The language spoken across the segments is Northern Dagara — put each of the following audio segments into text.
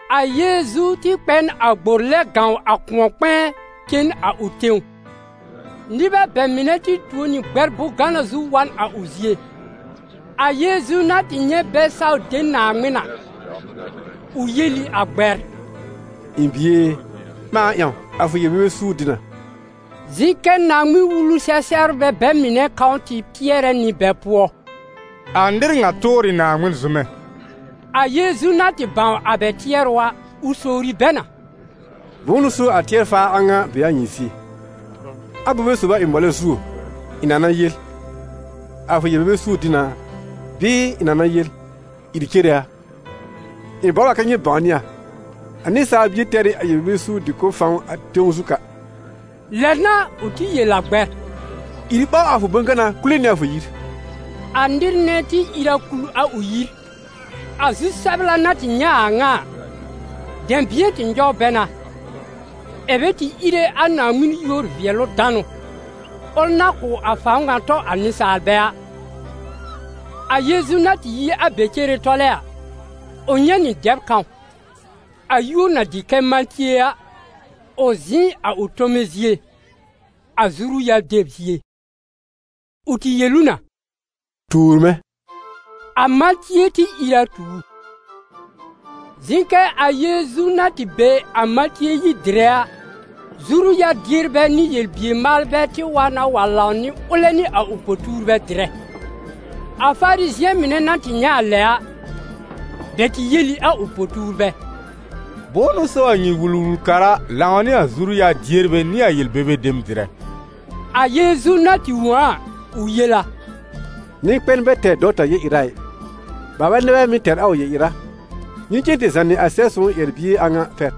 A Yeezu tɩ kpɛ n a gbor lɛb gãw a kʋ̃ɔ-kpɛ̃ɛ cen a ʋ tẽw. Nɩbɛ bɛ mɩnɛ tɩ tuo nɩ gbɛr bʋ̃-gana zu wa n a ʋ zie. A Yeezu na tɩ nyɛ̃ bɛ saw de Naaŋmɩn a, ʋ yel ɩ a gbɛr: «Ɩ̃ bie e, ɓãa ƴãw, a fʋ yel-bebe suur dɩ na.» Zɩ̃ kɛ Naaŋmɩn-Wulu-sɛ-sɛbrbɛ bɛ mɩnɛ kãw tɩ tɩɛrɛ nɩ bɛ pʋɔ: «A nɩr ŋa tʋʋr ɩ Naaŋmɩn zʋmɛ!» A Yeezu na tɩ bãw a bɛ tɩɛrʋ a, ʋ sowri bɛ na: «Bʋ̃ʋ n'ʋ so a tɩɛr-faar a ŋa be a nyɩ zie? Abobe sob a ɩ mɔlɛ zuo, ɩ̃ na na yel: ‹A fʋ yel-bebe suur dɩ na›, bɩɩ ɩ̃ na na yel: ‹Ìr cere a?› Ɩ̃ bɔbr a kɛ nyɩ bãwnɩ a, a Nɩsaal Bie tɛr ɩ a yel-bebe suur dɩ-kʋ̀b fãw a tẽw zu ka.» Lɛ n'a ʋ tɩ yel a gbɛr: «Ìr ɓaw a fʋ bʋ̃-gana kule nɩ a fʋ yir.» A nɩr nɛ tɩ ìr a kul a ʋ yir. A zu-sɛbla na tɩ nyɛ̃ a ŋa a, dɛ̃bɩ̃ɛ tɩ nyɔw bɛ na, ɛ̀ bɛ tɩ íre a Naaŋmɩn yúor-vɩɛlʋ-danʋ, ʋl na kʋ̀ a fãw ŋa tɔ a nɩsaalbɛ a. A Yeezu na tɩ yi a be cere tɔlɛ a, ʋ nyɛ̃ nɩ dɛb kãw, a yúor na dɩ kɛ Matie a, ʋ zɩ̃ a ʋ tome zie, a zuru-yar deb zie. Ʋ tɩ yel ʋ na: «Tuur mɛ̃!» A Matie tɩ ìr a tu ʋ. Zɩ̃ kɛ a Yeezu na tɩ be a Matie yir dɩrɛ a, zuru-yar-dierbɛ nɩ yel-bier-maalbɛ tɩ wa na wa lãw nɩ ʋlɛ nɩ a ʋ po-tuurbɛ dɩrɛ. A Farizɩ̃ɛ mɩnɛ na tɩ nyɛ̃ a lɛ a, bɛ tɩ yel ɩ a ʋ po-tuurbɛ: «Bʋ̃ʋ n'ʋ so a nyɩ Wul-wul-kara lãw nɩ a zuru-yar-dierbɛ nɩ a yel-bebe dem dɩrɛ?» A Yeezu na tɩ wõ a a, ʋ yel a: «Nɩ-kpɛn bɛ tɛr dɔwta yel-ɩra ɩ, baalbɛ nɛ bɛ mɩ́ tɛr a ʋ yel-ɩra. Nyɩ cen tɩ zànɩ a Sɛb-sõw ƴɛr-bie a ŋa pɛr: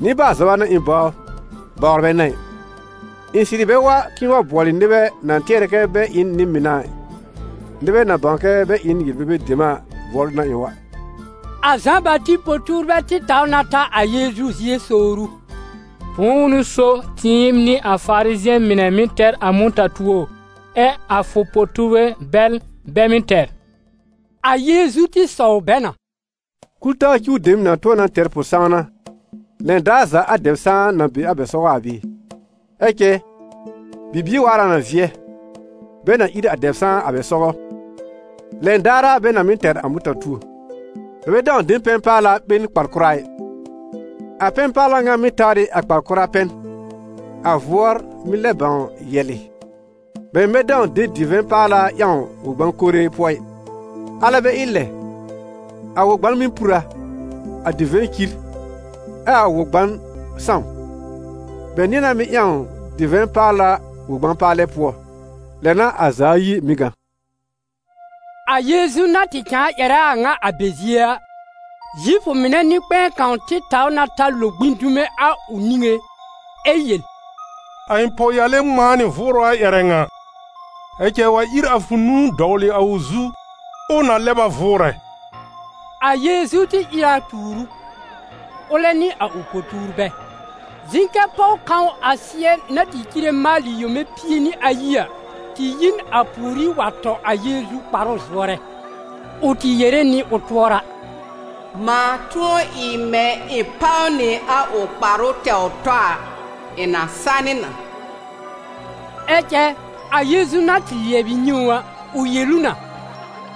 ‹Nɩ-baal-zɔba n'a ɩ̃ bɔbr, bawr bɛ n'a ɩ.› Ɩ̃ sɩrɩ bɛ wa k'ɩ̃ɩ wa bʋɔlɩ nɩbɛ na tɩɛrɛ kɛ bɛ ɩ n nɩ-mɩn a ɩ, nɩbɛ na bãw kɛ bɛ ɩ n yel-bebe dem a bʋɔlʋ n'a ɩ̃ wa.» A Zã-Bati po-tuurbɛ tɩ taw na ta a Yeezu zie sowr ʋ: «Bʋ̃ʋ n'ʋ so tɩɩm nɩ a Farizɩ̃ɛ mɩnɛ mɩ́ tɛr a mʋta-tuo, ɛ a fʋ po-tuurbɛ bɛl, bɛ mɩ́ tɛr?» A Yeezu tɩ sɔw bɛ na: «Kul-taa cuw dem na tʋ̃ɔ na tɛr pʋ-sãwna lɛn daar za a dɛb-sãan na be a bɛ sɔgɔ a bɩɩ? Ɛ cɛ bibie waar a na vɩɛ, bɛ na ír a dɛb-sãan a bɛ sɔgɔ, lɛn daar a bɛ na mɩ́ tɛr a mʋta-tuo. Bɛ bɛ dãw de pɛn-paala ɓe n kpar-kʋra ɩ; a pɛn-paala ŋa mɩ́ tawr ɩ a kpar-kʋra pɛn, a vʋɔr mɩ́ lɛb bãw yɛ̀lɩ̀. Bɛ mɩ̀ bɛ dãw de divɛ̃ paala ƴãw wɔ-gbã-kore pʋɔ ɩ, alɛ bɛ ɩ lɛ, a wɔ-gban mɩ́ pur a, a divɛ̃ cir, ɛ a wɔ-gban sãw. Bɛ nɩ̃ɛ na mɩ́ ƴãw divɛ̃ paala wɔ-gbã-paalɛ pʋɔ, lɛ n'a a za ayi mɩ́ gã.» A Yeezu na tɩ cãa ƴɛrɛ a a ŋa a bɛ zie a, Zifʋ mɩnɛ nɩ-kpɛ̃ɛ kãw tɩ taw na ta lo gbĩ dume a ʋ niŋé ɛ yel: «A ɩ̃ pɔwyale ŋmãa nɩ vʋʋrʋ a ƴɛrɛ ŋa, ɛ cɛ wa ír a fʋ nũu dɔwlɩ a ʋ zu, ʋʋ na lɛb a vʋʋrɛ.» A Yeezu tɩ ìr a tuur ʋ, ʋlɛ nɩ a ʋ po-tuurbɛ. Zɩ̃ kɛ pɔw kãw a sɩɛ na tɩ cire maalɩ yome pie nɩ ayi a, tɩ yi n a pùorí wa tɔ a Yeezu kparʋ zʋɔrɛ. Ʋ tɩ yere nɩ ʋ tʋɔra: «Mãa tʋ̃ɔ ɩ mɛ̃ ɩ̃ páw nɩ a ʋ kparʋ tɛwr tɔ a, ɩ̃ na sanɩ na.» Ɛ cɛ a Yeezu na tɩ lɩɛbɩ nyɛ̃ ʋ a, ʋ yel ʋ na: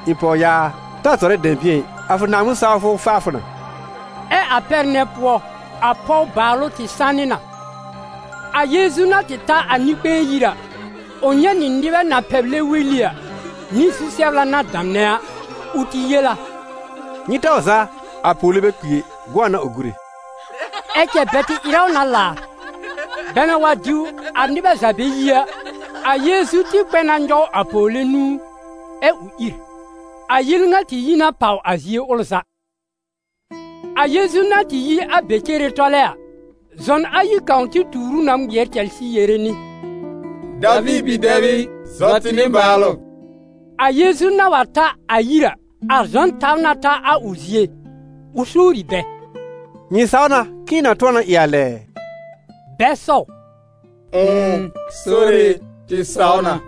«Ɩ̃ pɔwyaa a, ta zɔrɛ dɛ̃bɩ̃ɛ ɩ, a fʋ Naaŋmɩn-sawfʋ faa fʋ na.» Ɛ a pɛr nɛ pʋɔ, a pɔw baalʋ tɩ sanɩ na. A Yeezu na tɩ ta a nɩ-kpɛ̃ɛ yir a, ʋ nyɛ̃ nɩ nɩbɛ na pɛblɛ weli a, nɩ zu-sɛbla na damnɛ a. Ʋ tɩ yel a: «Nyɩ taw zaa, a pɔwle bɛ kpi ɛ, gʋ̃ɔ n'a ʋ gúre.» Ɛ cɛ bɛ tɩ ɩrɛ ʋ na laar. Bɛ na wa diw a nɩbɛ za bɛ yi a, a Yeezu tɩ kpɛ na nyɔw a pɔwle nũu, ɛ ʋ ìr. A yel ŋa tɩ yi na pàw a zie ʋl za. A Yeezu na tɩ yi a be cere tɔlɛ a, zɔn ayi kãw tɩ tuur ʋ na ŋmɩɛr cɛlsɩ yere nɩ: « Daviir bi-dɛb ɩ, zɔ tɩ nɩbaalʋ!» A Yeezu na wa ta a yir a, a zɔn taw na ta a ʋ zie, ʋ sowri bɛ: «Nyɩ saw na k'ɩ̃ɩ na tʋ̃ɔ na ɩ a lɛ ɛ?» Bɛ sɔw: «Ʋ̃ʋ, Sore e, tɩ saw na!»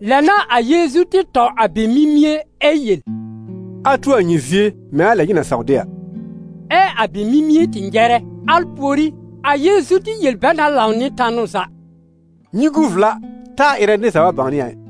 Lɛ n'a a Yeezu tɩ tɔ a bɛ mimie ɛ yel: «A tu a nyɩ zie mɛ̃ a lɛ nyɩ na saw de a.» Ɛ a bɛ mimie tɩ nyɛrɛ. Al pùorí, a Yeezu tɩ yel bɛ na lãw nɩ tanʋ za: «Nyɩ gu vla taa ɩrɛ nɩr za wa bãwnɩ a ɩ!»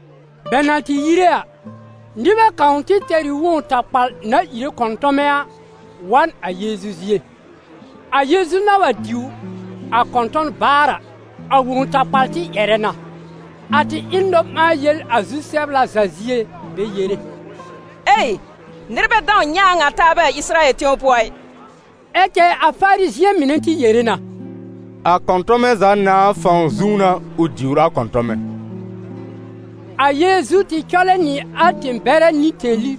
Bɛ na tɩ yire a, nɩbɛ kãw tɩ tɛr ɩ wõw-takpal na íre kɔ̃tɔmɛ a, wa n a Yeezu zie. A Yeezu na wa diw a kɔ̃tɔ̃n baar a, a wõw-takpal tɩ ƴɛrɛ na. A tɩ ɩ n nɔ-ɓãa-yel a zu-sɛbla za zie bɛ yere: «Nɩr bɛ dãw nyɛ̃ a a ŋa taabɛ a Ɩsɩrayɛl tẽw pʋɔ ɩ!» Ɛ cɛ a Farizɩ̃ɛ mɩnɛ tɩ yere na: «A kɔ̃tɔmɛ za nãà fãw zũú n'a ʋ diwr a kɔ̃tɔmɛ.» A Yeezu tɩ cɔlɛ nɩ a tẽ-bɛrɛ nɩ tẽli,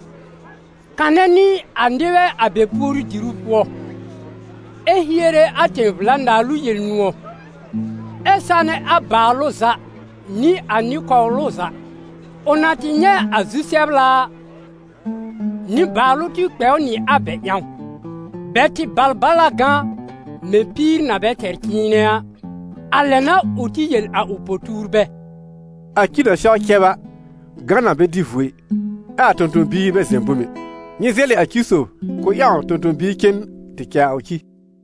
kanɛ nɩ a nɩbɛ a bɛ puoru-diru pʋɔ, ɛ hiere a tẽ-vla-naalʋ Yel-nʋ̃ɔ̀, ɛ sanɛ a baalʋ za nɩ a nɩ-kɔwlʋ za. Ʋ na tɩ nyɛ̃ a zu-sɛbla a, nɩbaalʋ tɩ kpɛ ʋ nɩ a bɛ ƴãw; bɛ tɩ bal bal a gã mɛ̃ píir na bɛ tɛr cɩ̃ɩnɛ a. A lɛ n'a ʋ tɩ yel a ʋ po-tuurbɛ: «A ci na sɛw cɛb a, gã na bɛ dɩ vuo ɩ, ɛ a tõ-tõ-biir bɛ zɛ̃ bom ɛ; nyɩ zɛlɩ a ci sob k'ʋʋ ƴãw tõ-tõ-biir cen tɩ cɛ a ʋ ci.»